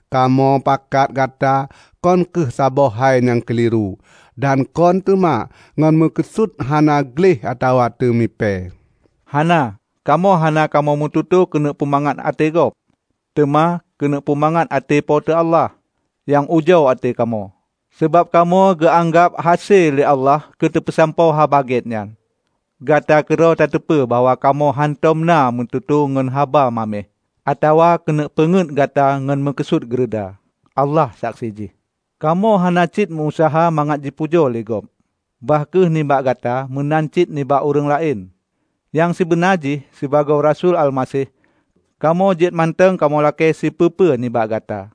Kamoe pakat gata kon kheueh saboh hai nyang keuliru; dan kon teuma ngon meukeusut hana gleh atawa teumipée. Hana! Kamoe hana kamoe meututoe keuneuk peumangat até gob, teuma keuneuk peumangat até Po teu Allah, nyang ujoe até kamoe. Sabab kamoe geuanggab hase lé Allah keuteupeusampoe Haba Gét nyan. Gata keudroe tateupeue bahwa kamoe hántom na meututoe ngon haba maméh atawa keuneuk peungeut gata ngon meukeusut geureuda. Allah saksi jih! Kamoe hana cit meu-useuha mangat jipujoe lé gob -- bah kheueh nibak gata meunan cit nibak ureuëng laén. Nyang sibeuna jih sibagoe rasui Almaseh, kamoe jeuet mantong kamoe lakée sipeue-peue nibak gata.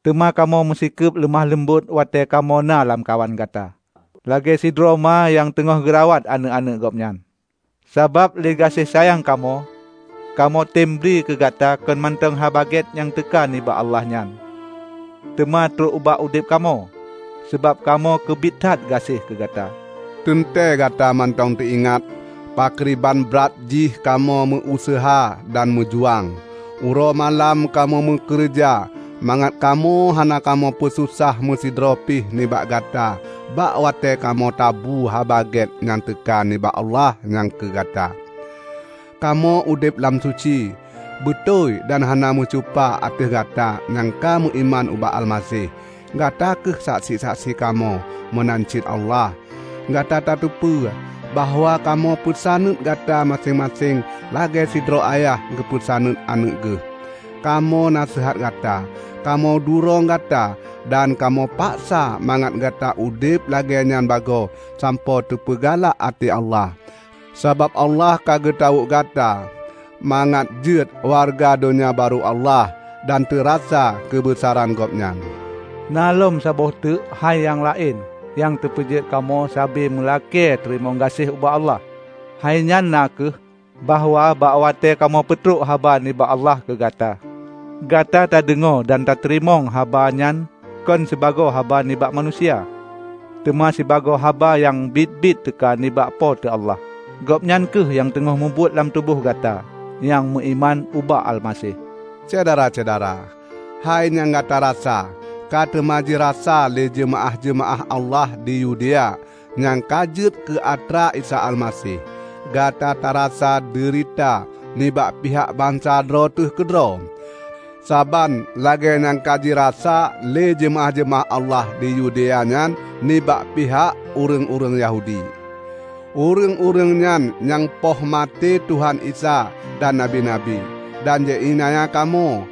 Teuma kamoe meusikeub leumoh-leumbot watée kamoe na lamkawan gata, lagée sidroe ma nyang teungoh geurawat aneuëk-aneuëk gobnyan. Sabab lé gaséh sayang kamoe, kamoetém bri keugata kon mantong Haba Gét nyang teuka nibak Allah nyan, teuma trok ubak udeb kamoe. Sabab kamoe keubiet that gaséh keugata. Teuntée gata mantong teuingat pakriban brat jih kamoe meu-useuha dan meujuang. Uroe malam kamoe meukeureuja mangat kamoe hana kamoe peususah meusidroe pih nibak gata bak watée kamoe tabu Haba Gét nyang teuka nibak Allah nyan keugata. Kamoe udeb lam suci, beutôi dan hana meucupa ateueh gata nyang ka meuiman ubak Almaseh, gata kheueh saksi-saksi kamoe, meunan cit Allah. Gata tateupeue bahwa kamoe peusaneut gata maséng-maséng lagée sidroe ayah geupeusaneut aneuëk geuh. Kamoe naseuhat gata, kamoe durong gata dan kamoe paksa mangat gata udeb lagée nyan bagoe sampoe teupeugalak até Allah. Sabab Allah ka geutawök gata mangat jeuet wareuga Donya Barô Allah dan teurasa keubeusaran Gobnyan. Na lom saboh teuk hai nyang laén nyang teupeujeuet kamoe sabe meulakée teurimong gaséh ubak Allah. Hainyan na kheueh, bahwa bak watée kamoe peutrok haba nibak Allah keugata, gata tadeungoe dan tateurimong haba nyan kon sibagoe haba nibak manusia, teuma sibagoe haba nyang biet-biet teuka nibak Po teu Allah. Gobnyan kheueh nyang teungoh mubuet lam tuboh gata nyang meuiman ubak Almaseh. Syedara-syedara, hai nyang gata rasa ka teuma jirasa lé jeumaáh-jeumaáh Allah di Yudea nyang ka jeuet keu atra Isa Almaseh. Gata tarasa deurita nibak pihak bansa droe teuh keudroe, saban lagée nyang ka jirasa lé jeumaáh-jeumaáh Allah di Yudea nyan nibak pihak ureuëng-ureuëng Yahudi. Ureuëng-ureuëng nyan nyang poh maté Tuhan Isa dan nabi-nabi, dan ji iénanya kamoe.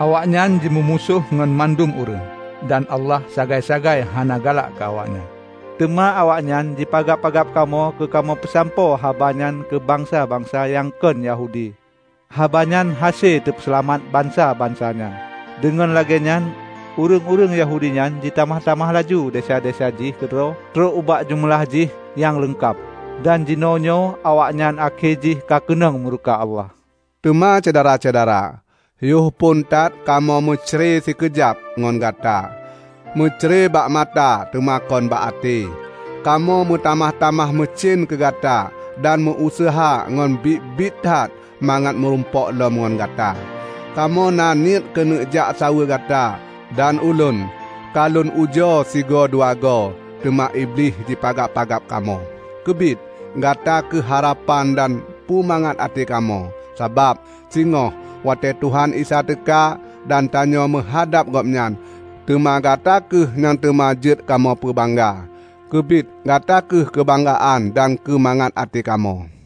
Awaknyan jimeumusoh ngon mandum ureuëng, dan Allah sagai-sagai hana galak keu awaknyan. Teuma awaknyan jipagab-pagab kamoe keukamoe peusampoe habanyan keu bansa-bansa nyang kon Yahudi haba nyang hase teupeuseulamat bansa-bansa nyan. Deungon lagée nyan, ureuëng-ureuëng Yahudi nyan jitamah-tamah laju desya-desya jih keudroe trok ubak jeumeulah jih nyang leungkab. Dan jinoenyoe awaknyan akhé jih kakeunong meureuka Allah! Teuma syedara-syedara, yoh phon that kamoe meucre sikeujab ngon gata -- meucre bak mata teuma kon bak até -- kamoe meutamah-tamah meucen keugata dan meu-useuha ngon biet-biet that mangat meurumpok lom ngon gata! Kamoe naniet keuneuk jak saweue gata; dan ulôn, ka lôn ujoe sigoe dua goe, teuma Iblih jipagab-pagab kamoe. Keubiet, gata kheueh harapan dan pumangat até kamoe. Sabab, singoh watée Tuhan Isa teuka, dan tanyoe meuhadab Gobnyan, teuma gata kheueh nyang teuma jeuet kamoe peubangga! Keubiet gata kheueh keubanggaan dan keumangat até kamoe!